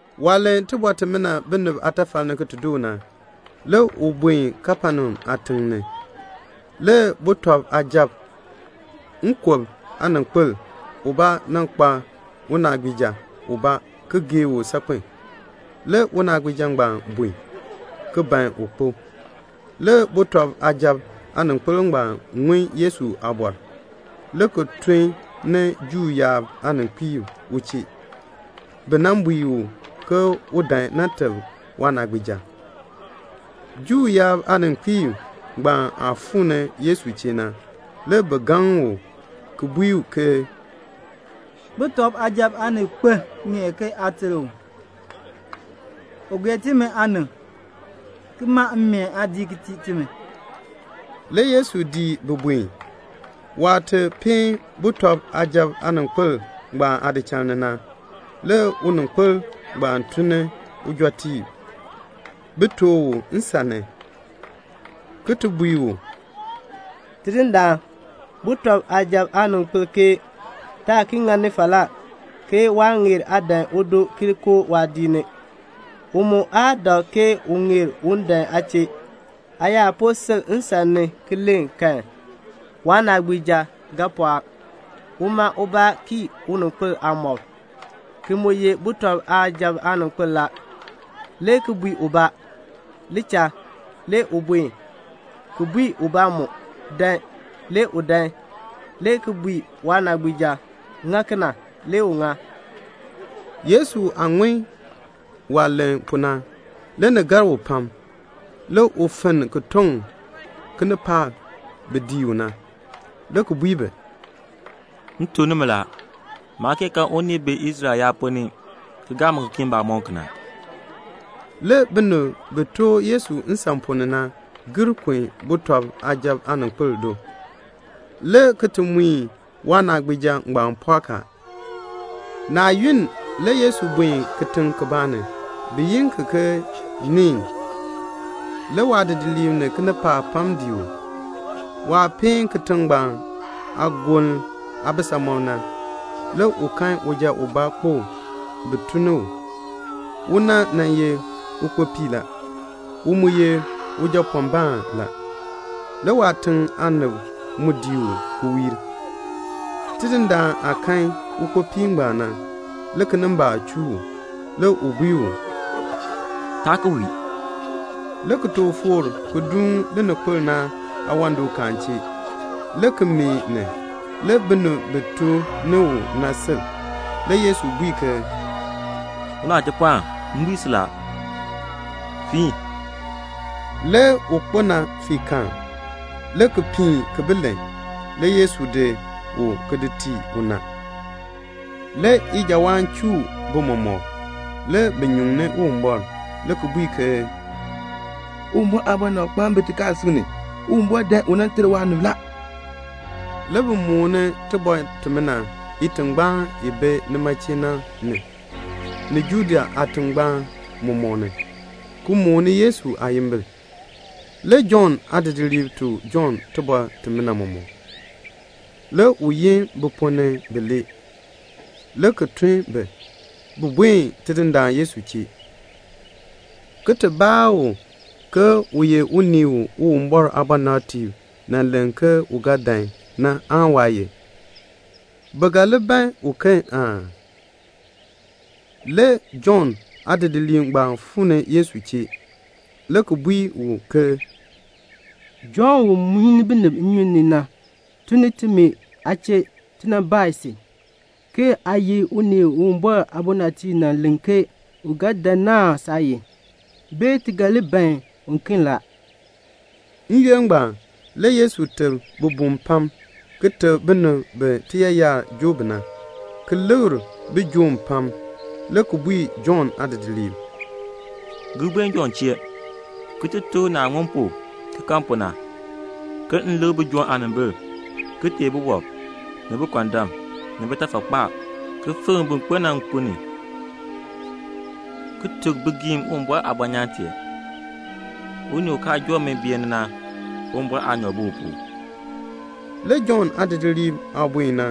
Waah len iliin imina binib aatafal ni ki ti doo na, le u buen Kapenaum aatiŋ ni. Le sujatiib nkub aaninkpil ubaa nan kpa unaagbiija ubaa ki gee u saakpen. Le unaagbiija ngbaan bun, ki ban un kpo. Le sujatiib aaninkpil ngbaan ŋun Yesu aabɔr, le ki tun ni Juu yaab aaninkpiib u chee, bi nan bui u ke un dan nan teb waanaagbiija. Juu yaab aaninkpiib ngbaan aah fuu ni Yesu chee na, le bi gaŋ u ki bui ke, "Sujatiib aaninkpil ŋeer ke aa ter u. U gee timi aanib, ki maa mmeen aadiik ki tii timi." Le Yesu dii bi ki buen. Waah ti peen sujatiib aaninkpil aadichal na, le uninkpil ngbaan tun ni ujɔtiib bi nan tooh u nsan ni, ki bui u, "Tidindaan, sujatiib aaninkpil ke: Taa ki ŋani falaa, ke waa ŋeer aa dan udo ki koo waadiik ni. U mu aa dak ke u ŋeer un dan aa chee. Aa yaa po sil nsan ni ki len kan, waanaagbiija ga pɔɔk. Uma ubaa kii uninkpil aamɔb, ki mu ye sujatiib aaninkpil la, le ki bui ubaa, 'Li cha,' le u buen; le ki bui ubaa mu, 'Dan,' le u dan; le ki bui waanaagbiija, 'Ŋa kena,' le u ŋa." Yesu aah ŋun waah len kena na, le ni gar u pam. Le u fenn ki toŋ kinipaak bi dii u na, le ki bui bi, "M tuk nimi la, maa kee kan unii u bi Israel yaab ponn ni ki gaa mi ki kii mbamɔm kena." Le binib bi tooh Yesu nsan ponn ni na gir kun sujatiib aaninkpil do, le ki mui waanaagbiija ngbaan pɔɔk a. Naa yunn le Yesu buen kitiŋ kibaa ni, bi yi ki ke Neen. Le waadidiliib ni kinipaak pam dii u. Waah peen kitiŋ ngbaan aagoln aabisamɔb na, le u kan uja ubaa kpo bi tun ni u. Una ye ukpopii la. U mu ye ujapɔɔnbaan la. Le waatiŋ aanib mu dii u ki wiir. Tidindaan aah kan ukpopii ngbaan na, le kinimbaak chuu u. Le u bui u, "Taa ki wii," le ki tooh foor ki duun lininkpol na aawandɔkaan chee, le ki meeh ni. Le binib bi tun ni u na sil. Le Yesu bui ke, "Unachipɔɔn, m bui si, fiin." Le un kpo na fii kal, le ki piin ki bi len. Le Yesu di u ki di tii una. Le ijawaan chuu bi mɔmɔk. Le bi nyuŋni Uwumbɔr, le ki bui ke, "Uwumbɔr aabɔnabkpaan bi tikaasisik ni. Uwumbɔr dan u nan ter waanib la." Le bi mooni tibɔr timina itingbaan i bi nima chee na ni, ni Judea aatingbaan mɔmɔk ni, ki mooni Yesu aayimbil. Le Jɔnn aadidiliib tuk Jɔnn tibɔr timina mɔmɔk. Le u yin bi ponn ni bilee, le ki tun bi, bin buen Tidindaan Yesu chee, ki ti baa u ke u ye unii u Uwumbɔr aabɔnabtiib nan len ke u ga dan na aan waa ye? Bi ga li ban uken aa? Le Jɔnn aadidiliib ngbaan fuu ni Yesu chee le ki bui u ke, "Jɔnn u muini binib nnyun ni na tun ni timi aa chee ti nan baa si, ke 'Aa ye unii u Uwumbɔr aabɔnabtiib nan len ke u ga dan na aan saa ye, bee ti ga li ban uken aa?"' N-yoonn ngbaan le Yesu teb bibum pam, ki teb binib bi tiyaayar joo bi na, ki likr bijoom pam; le ki bui Jɔnn aadidiliib, "Gir buen Jɔnn chee, ki ti tuk u naah ŋun pu ki kan pu na, ke m likr bijoom aanimbil, ki teei biwɔb, ni bikɔndam, ni bitafakpaab, ki fikr bin kpo na nkun ni, ki tuk bigiim Uwumbɔr aabɔnyaan tee. Unii u kaa joo mi beeni na, Uwumbɔr aanyoor bi u pu." Le Jɔnn aadidiliib aah buen na,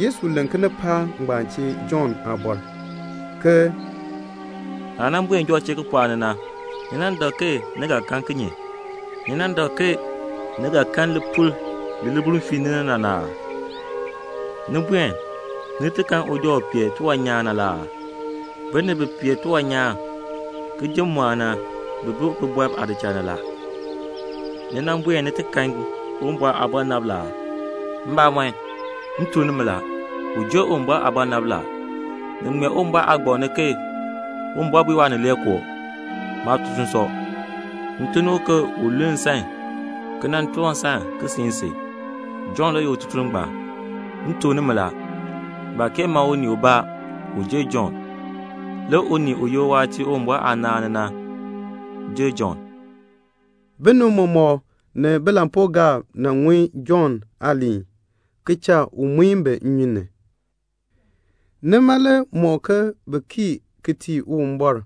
Yesu len kinipaak ngbaan chee Jɔnn aabɔr, ke "Naah nan buen Jɔnn chee kipɔɔk ni na, ni nan dak ke ni ga kan kinye? Ni nan dak ke ni ga kan lipul li libuln fiini li na aa? Ni buen ni ti kan uja u pee tiwan nyaan na aa? Binib bi pee tiwan nyaan ki ji mmɔɔn na, bi bi bibɔrb aadichal ni la. Ni buen ni ti kan Uwumbɔr aabɔnabr la aa? Mbamɔn, m tuk nimi la, u jer Uwumbɔr aabɔnabr la. Ni ŋmee Uwumbɔr aagbaŋ ni ke Uwumbɔr bui Waanileekoo, 'Maatutuln sɔ. M tun ni u ke un luln nsan, ki nan toor nsan ki siin si.' Jɔnn le ye ututuln ngbaan. M tuk nimi la, baa kee ma unii ubaa u jer Jɔnn. Le unii u ye uwaatiir Uwumbɔr aanaan ni na, u jer Jɔnn." Binib mɔmɔk ni bilampuugaab nan ŋun Jɔnn aaliin, ki cha u muin bi nnyun ni. Nima le mɔk ke bi kii ki tii Uwumbɔr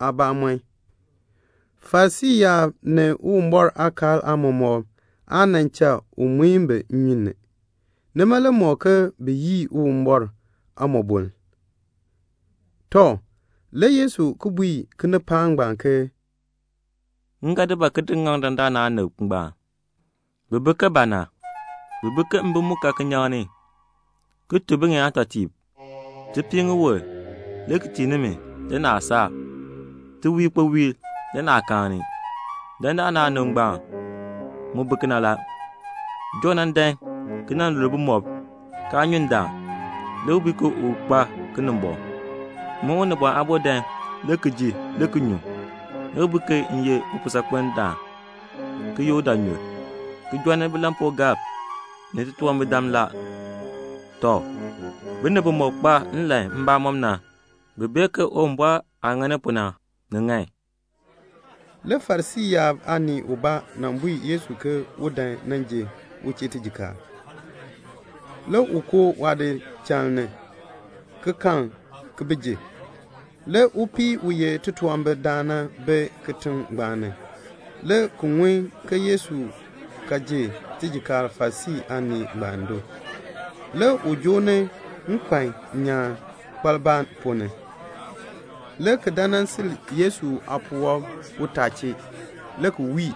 aabamɔn. Farisii yaab ni Uwumbɔr aakaal aamɔmɔkb aa nan cha u muin bi nnyun ni. Nima le mɔk ke bi yii Uwumbɔr aamɔboln. Tɔ, le Yesu ki bui kinipaak ngbaan ke "M ga di ba ki di ŋaŋ dandana aanib ngbaan? Bi bi ke ba na? Bi bi ke mbim mu ka kinyaŋ ni ki bui biŋeen aatɔtiib, 'Ti pii ŋiwul le ki tii nimi, le naa saar. Ti wii ikpowiil, le naa kaani.' Dandana aanib ngbaan mu bi kena la; Jɔnn nan dan ki nan lul bumɔb, kaa nyu ndaan, le bi bui ke u kpa Kinimbɔŋ. Min Unibɔn Aabo nan dan le ki ji le ki nyu, le bi bui ke m ye upuusaakpendaan ki ye udaanyur, ki jɔnni bilampuugaab ni titunwambirdam la. Tɔ, binib bimɔk kpa nlan mbamɔm na, bi bee ke Uwumbɔr aah ŋani pu na, ni ŋan." Le Farisii aanii ubaa nan bui Yesu ke un dan nan ji u chee tijikaar. Le u koo waadichal ni, ki kal ki ji. Le upii u ye titunwambirdaan na bi kitiŋ ngbaan ni, le ki ŋun ke Yesu ka ji tijikaar Farisii aanii ngbaan do. Le u joo ni nkpan nyaan kpaliba ponn ni, le ki dan nan sil Yesu aapuwɔb utaa chee, le ki wii,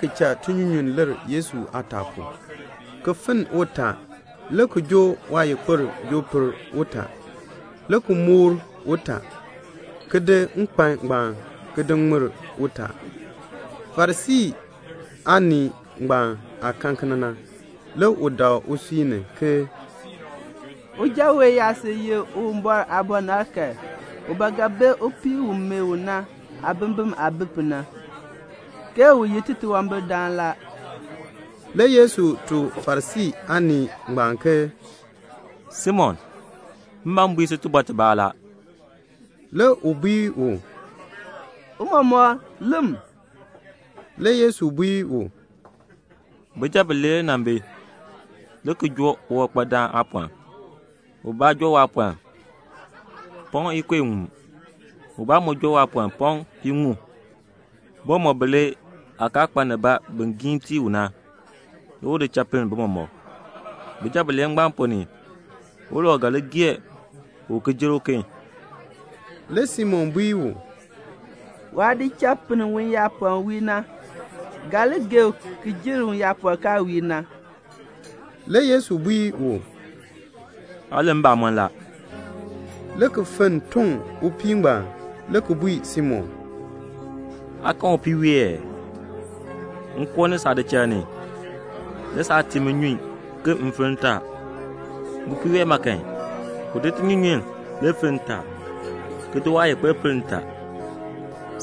ki cha tinyunyunn lir Yesu aataa pu, ki finn utaa, le ki joo waayikpir joo per utaa, le ki moor utaa, ki di nkpan ngbaan ki di ŋmir utaa. Le Farisii aanii ngbaan aah kan kena na, u dak usui ni ke "Uja wee yaa sil ye Uwumbɔr aabɔnabr kan, u ba ga bee upii u meeh u na aabimbin aah bi pu na, ke u ye titunwambirdaan la." Le Yesu tuk Farisii aanii ngbaan ke "Simon, m ban m bui si tibɔr tibaa la." Le u bui u, "Tiicha, lem." Le Yesu bui u, "Bijab bilee le nan bi, le ki joo uwankpadaan aapɔln. Ubaa joo waapɔln pɔŋ ikub iŋmu, ubaa mu joo waapɔln pɔŋ piiŋmu. Bi mɔmɔk bilee aah kaa kpa nibaa bin giin tii u na, le u di cha pinn tii bi mɔmɔk. Bijab bilee ngbaan ponn ni, ulau ga li gee u ki jer uken?" Le Simon bui u, "Waah di cha pinn uyaapɔln wiir na ga li gee u ki jer uyaapɔln kaa wiir na." Le Yesu bui u, "Aa len mbamɔn la," le ki fenn ki toŋ upii ngbaan, le ki bui Simon, "Aa kan upii wee ee? M koo ni saadichal ni, le saa tii mi nnyun ke m finn ntaa. Upii wee ma kan, uma le di tinyunyunn ki finn ntaa, ki di waayikpir ki per ntaa.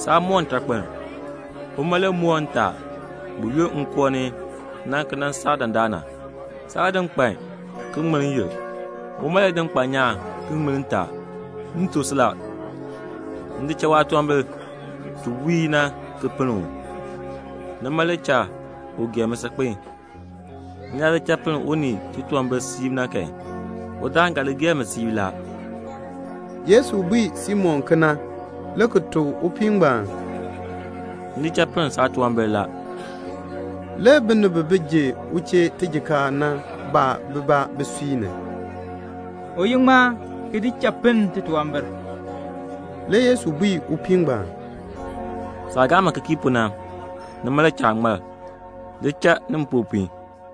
Saa moor ntakpiln. Uma le moor ntaa buyoonn m koo ni na ki nan saa dandana. Saa di nkpan ki ŋmir n-yil. Uma le di nkpan nyaan ki ŋmir ntaa. M tuk si la, m di cha waatunwambir ti wiir na ki pinn u. Nima le cha u gee mi saakpen. M yaa di cha pinn unii titunwambir siib na kan, udaan ga li gee mi siib." Yesu bui Simon kena, le ki tuk upii ngbaan, "M di cha pinn saatunwambir la." Le binib bi ji u chee tijikaar na baa bibaa bisui ni, "U ye ŋmaa ki di cha pinn titunwambir?" Le Yesu bui upii ngbaan, "Saah gaa mi ki kii pu na, nima le cha aa ŋmar. Li cha ni mpopiin."